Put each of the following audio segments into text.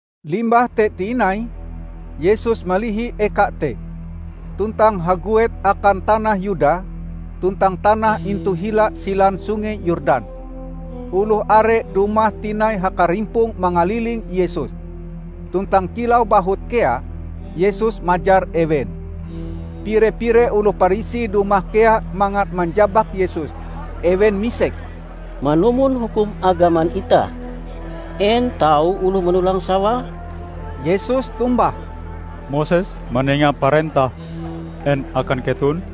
Limbah te tinai Yesus malihi eka te, tuntang haguet akan tanah Yuda tuntang tanah intu hila silan Sungei Yordan. Oloh are dumah tinai hakarimpong mangaliling Yesus. Tuntang kilau bahut kea, Yesus majar ewen. Pire-pire oloh Parisi dumah kea mangat manjabak Yesus. Ewen misek, "Manumon hukum agaman itah, en tau oloh manolang sawae?" Yesus tombah, "Moses manenga parentah en akan keton?"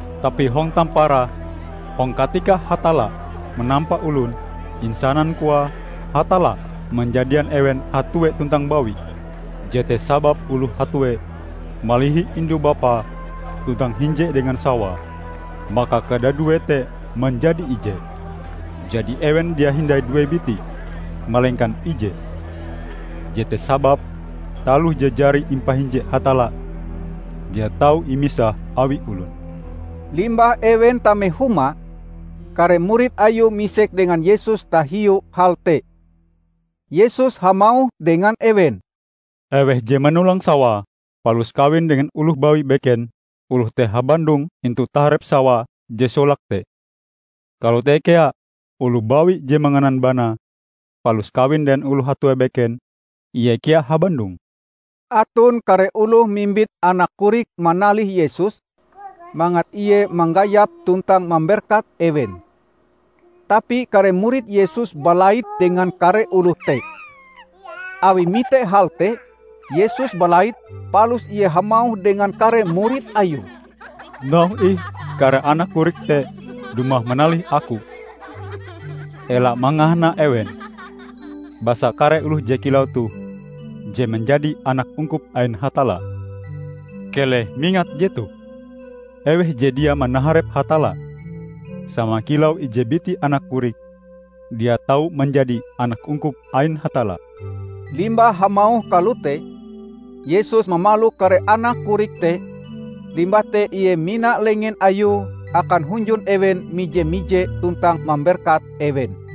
"Tapi hong tamparae, hong katika Hatalla manampa olon, insanan koae, 'Hatalla manjadian ewen hatue tuntang bawi. Jete sababe oloh hatue malihi indu-bapae tuntang hinje dengan sawae, maka kadaduee te manjadi ije.' Jadi ewen dia hindai due biti, malengkan ije. Jete sababe, taloh je jari impahinje Hatalla, dia tau imisah awi olon!" Limbah ewen tame huma, kare murid Ayue misek dengan Yesus tahiu hal te. Yesus hamauh dengan ewen, "Eweh je manolang sawae palus kawin dengan oloh bawi beken, oloh te habandong intu taharep sawae je solake te. Kalote kea oloh bawi je manganan banae palus kawin dengan oloh hatue beken, ie kea habandong." Aton kare oloh mimbit anak korik manalih Yesus mangat Ie manggayap tuntang mamberkat ewen. Tapi kare murid Yesus balait dengan kare oloh te. Awi mite hal te, Yesus balait palus Ie hamauh dengan kare murid Ayue, "Nauhe ih kare anak korik te dumah manalih Aku! Ela mangahana ewen, basa kare oloh je kilau toh je manjadi anak ungkup ain Hatalla. Keleh mingat jetoh! Eweh je dia manaharep Hatalla sama kilau ije biti anak korik, dia tau manjadi anak ungkup ain Hatalla." Limbah hamauh kalote, Yesus mamalok kare anak korik te, limbah te Ie mina lengen Ayue akan hunjun ewen mije-mije tuntang mamberkat ewen.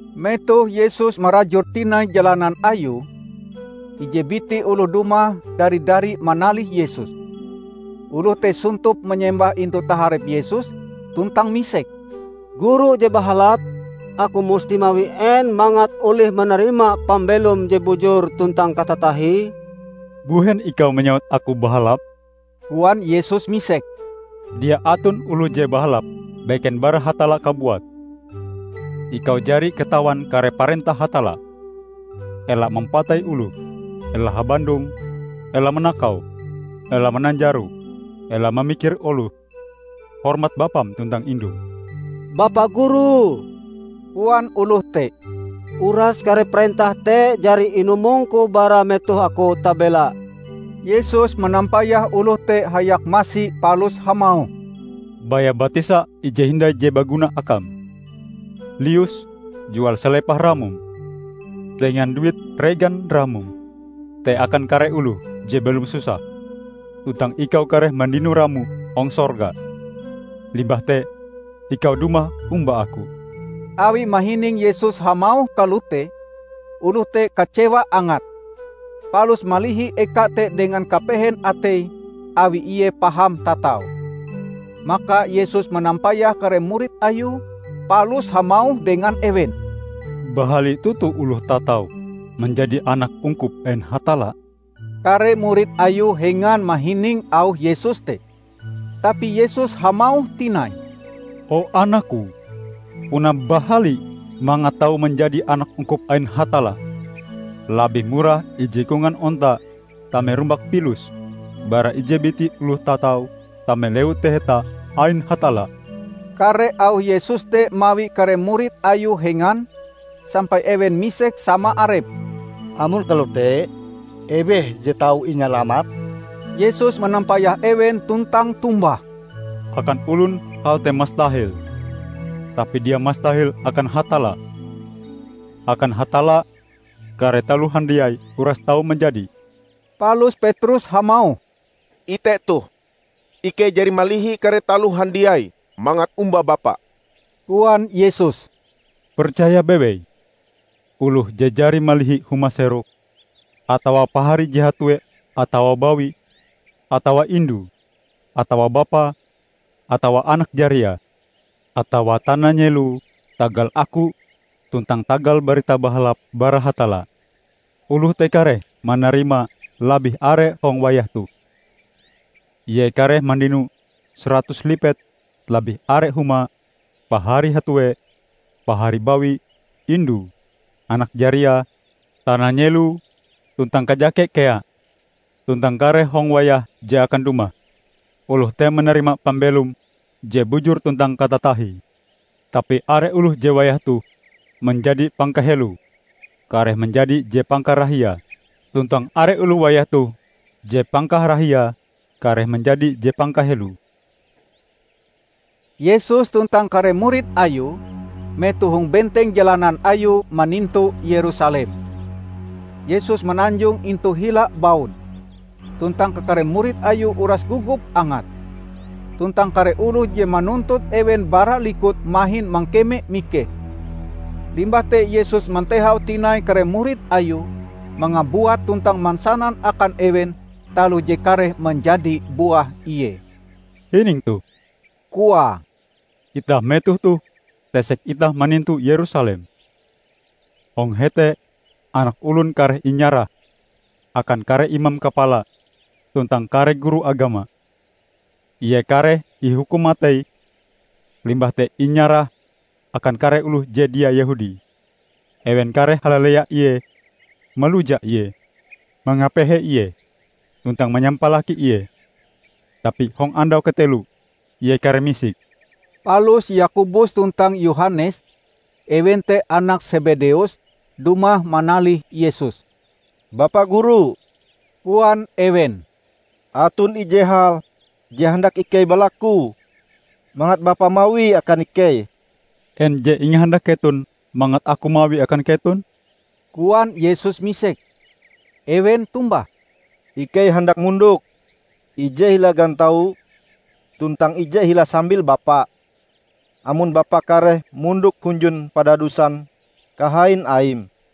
Metoh Yesus marajur tinai jalanan Ayue, ije biti oloh dumah dari-dari manalih Yesus. Oloh te sontop manyembah intu taharep Yesus tuntang misek, "Guru je bahalap, aku musti mawi en mangat olih manarima pambelom je bujur tuntang katatahie?" "Mbuhen ikau manyewut aku bahalap?" koan Yesus misek. "Dia aton oloh je bahalap, beken bara Hatalla kabuat. Ikau jari katawan kare parentah Hatalla. 'Ela mampatei oloh, ela habandong, ela manakau, ela mananjaro, ela mamikir oloh, hormat bapam tuntang indum.' " "Bapa Guru," koan oloh te, "uras kare parentah te jari inumongku bara metoh aku tabela." Yesus manampayah oloh te hayak masi palus hamauh, "Baya batisa ije hindai je baguna akam. Lius, jual salepah ramom; tenga duit regan ramom te akan kare oloh je belom susah, tuntang ikau kareh mandino ramo hong sorga. Limbah te ikau dumah omba Aku." Awi mahining Yesus hamauh kalote, oloh te kacewa angate, palus malihi eka te dengan kapehen ateie awi ie paham tatau. Maka Yesus manampayah kare murid Ayue palus hamauh dengan ewen, "Bahali toto oloh tatau manjadi anak ungkup ain Hatalla!" Kare murid Ayue hengan mahining auh Yesus te. Tapi Yesus hamauh tinai, "O, anak-Ku, puna bahali mangat tau manjadi anak ungkup ain Hatalla! Labih murah ije kongan onta tame rumbak pilus bara ije biti oloh tatau tame Lewu Taheta ain Hatalla." Kare auh Yesus te mawi kare murid Ayue hengan, sampai ewen misek sama arepe, "Amon kalote, eweh je tau inyalamat?" Yesus manampayah ewen tuntang tombah, "Akan olon hal te mastahel, tapi dia mastahel akan Hatalla; akan Hatalla kare taloh handiai uras tau manjadi." Palus Petrus hamauh, "Ite toh, ikei jari malihi kare taloh handiai mangat omba Bapa." Koan Yesus, "Percaya bewei: oloh je jari malihi huma-seroke, atawa paharie je hatue atawa bawi, atawa indue, atawa bapae, atawa anak jariae, atawa tana-nyeloe tagal Aku tuntang tagal Barita Bahalap bara Hatalla, oloh te kareh manarima labih are hong wayah toh. Ie kareh mandino saratus lipet labih are humae, paharie hatue, pahari bawi, indue, anak jariae, tana nyeloe -- tuntang kajake kea. Tuntang kareh hong wayah je akan dumah, oloh te manarima pambelom je bujur tuntang katatahie. Tapi are oloh je wayah toh manjadi pangkaheloe kareh manjadi je pangkarahiae tuntang are oloh wayah toh je pangkarahiae kareh manjadi je pangkaheloe." Yesus tuntang kare murid Ayue metoh hong benteng jalanan Ayue manintu Yerusalem. Yesus mananjong intu hila baun, tuntang kakare murid Ayue uras gogop angate. Tuntang kare oloh je manuntut ewen bara likut mahin mangkeme mikeh. Limbah te Yesus mantehau tinai kare murid Ayue mangabuat tuntang mansanan akan ewen taloh je kareh manjadi buah Ie. "Hining toh," koae, "Itah metoh toh tesek itah manintu Yerusalem. Hong hete Anak Olon kareh inyarah akan kare imam kapala tuntang kare guru agama. Ie kareh ihukum matei limbah te inyarah akan kare oloh je dia Yehudi. Ewen kareh halalea Ie, maluja Ie, mangapehe Ie, tuntang manyampalaki Ie. Tapi hong andau kateloe Ie kareh misik." Palus Yakobus tuntang Yohanes, ewen te anak Sebedeus, dumah manalih Yesus. "Bapa Guru," koan ewen, "aton ije hal je handak ikei balaku mangat Bapa mawie akan ikei." "En je ingahandak keton mangat aku mawie akan keton?" koan Yesus misek. Ewen tombah, "Ikei handak mondok ije hila gantau tuntang ije hila sambil Bapa, amon Bapa kareh mondok hunjun padadusan kahain Aim."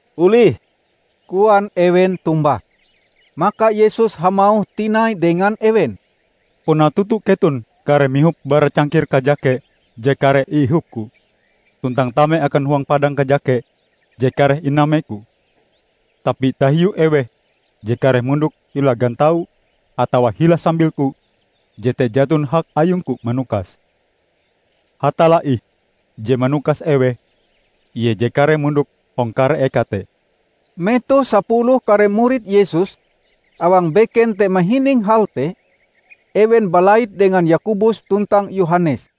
"Olih," koan ewen tombah. Maka Yesus hamauh tinai dengan ewen, "Puna toto keton kareh mihop bara cangkir kajake je kareh iihop-Ku, tuntang tame akan huang padang kajake je kareh iname-Ku. Tapi tahiu eweh je kareh mondok hila gantau atawa hila sambil-Ku, jete jaton hak ayung-Ku manukase. Hatalla ih je manukase eweh ie je kareh mondok hong kare eka te." Metoh sapuluh kare murid Yesus awang beken te mahining hal te, ewen balait dengan Yakobus tuntang Yohanes.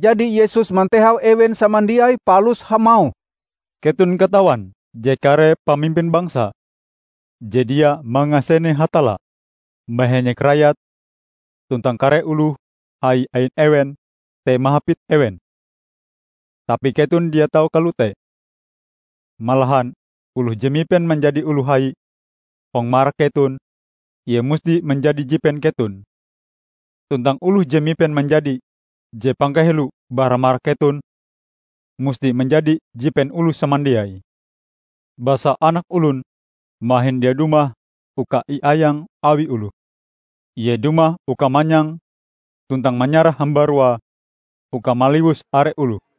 Jadi Yesus mantehau ewen samandiai palus hamauh, "Keton katawan je kare pamimpin bangsa je dia mangasene Hatalla, mahenyek rayate. Tuntang kare oloh hai ain ewen te mahapit ewen. Tapi keton dia tau kalote! Malahan oloh je mipen manjadi oloh hai hong marak keton, ie musti manjadi jipen keton. Tuntang oloh je mipen manjadi je pangkaheloe bara marak keton, musti manjadi jipen oloh samandiai. Basa Anak Olon mahin dia dumah uka iayang awi oloh. Ie dumah uka manyang tuntang manyarah hambaruae uka maliwus are oloh."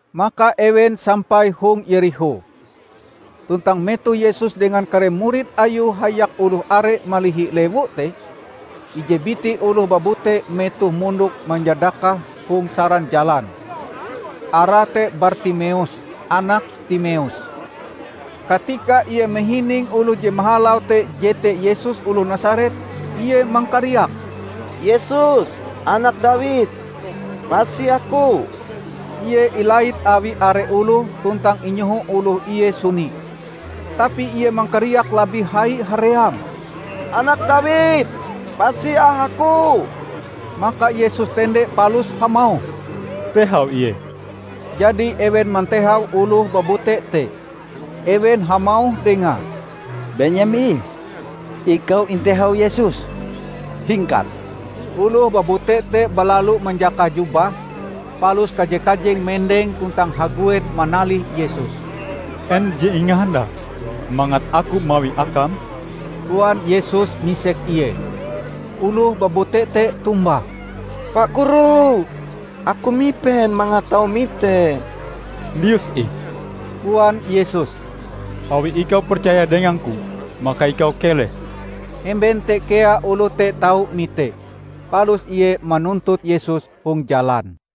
Maka ewen sampai hong Yerikho. Tuntang metoh Yesus dengan kare murid Ayue hayak oloh are malihi lewu te, ije biti oloh babute metohe mondok manyadakah hong saran jalan. Arae te Bartimeus, anak Timeus. Katika ie mahining oloh je mahalau te jete Yesus oloh Nasaret, ie mangkariak, "Yesus, Anak Dawid! Pasi aku!" Ie ilait awi are oloh tuntang inyoho oloh ie suni. Tapi ie mangkariak labih hai haream, "Anak Dawid, pasi ah aku!" Maka Yesus tende palus hamauh, "Tehau ie." Jadi ewen mantehau oloh babute te. Ewen hamauh dengae, "Benyem ih! Ikau intehau Yesus, hingkat!" Oloh babute te balalu manjakah jubahe, palus kaje-kajeng mendeng tuntang haguet manalih Yesus. "En je ingahandakm mangat Aku mawie akam?" koan Yesus misek ie. Oloh babute te tombah, "Pa Guru, aku mipen mangat tau mite." "Lius ih," koan Yesus, "awi ikau percaya dengangku, maka ikau keleh." Hemben te kea oloh te tau mite. Palus ie manuntut Yesus hong jalan.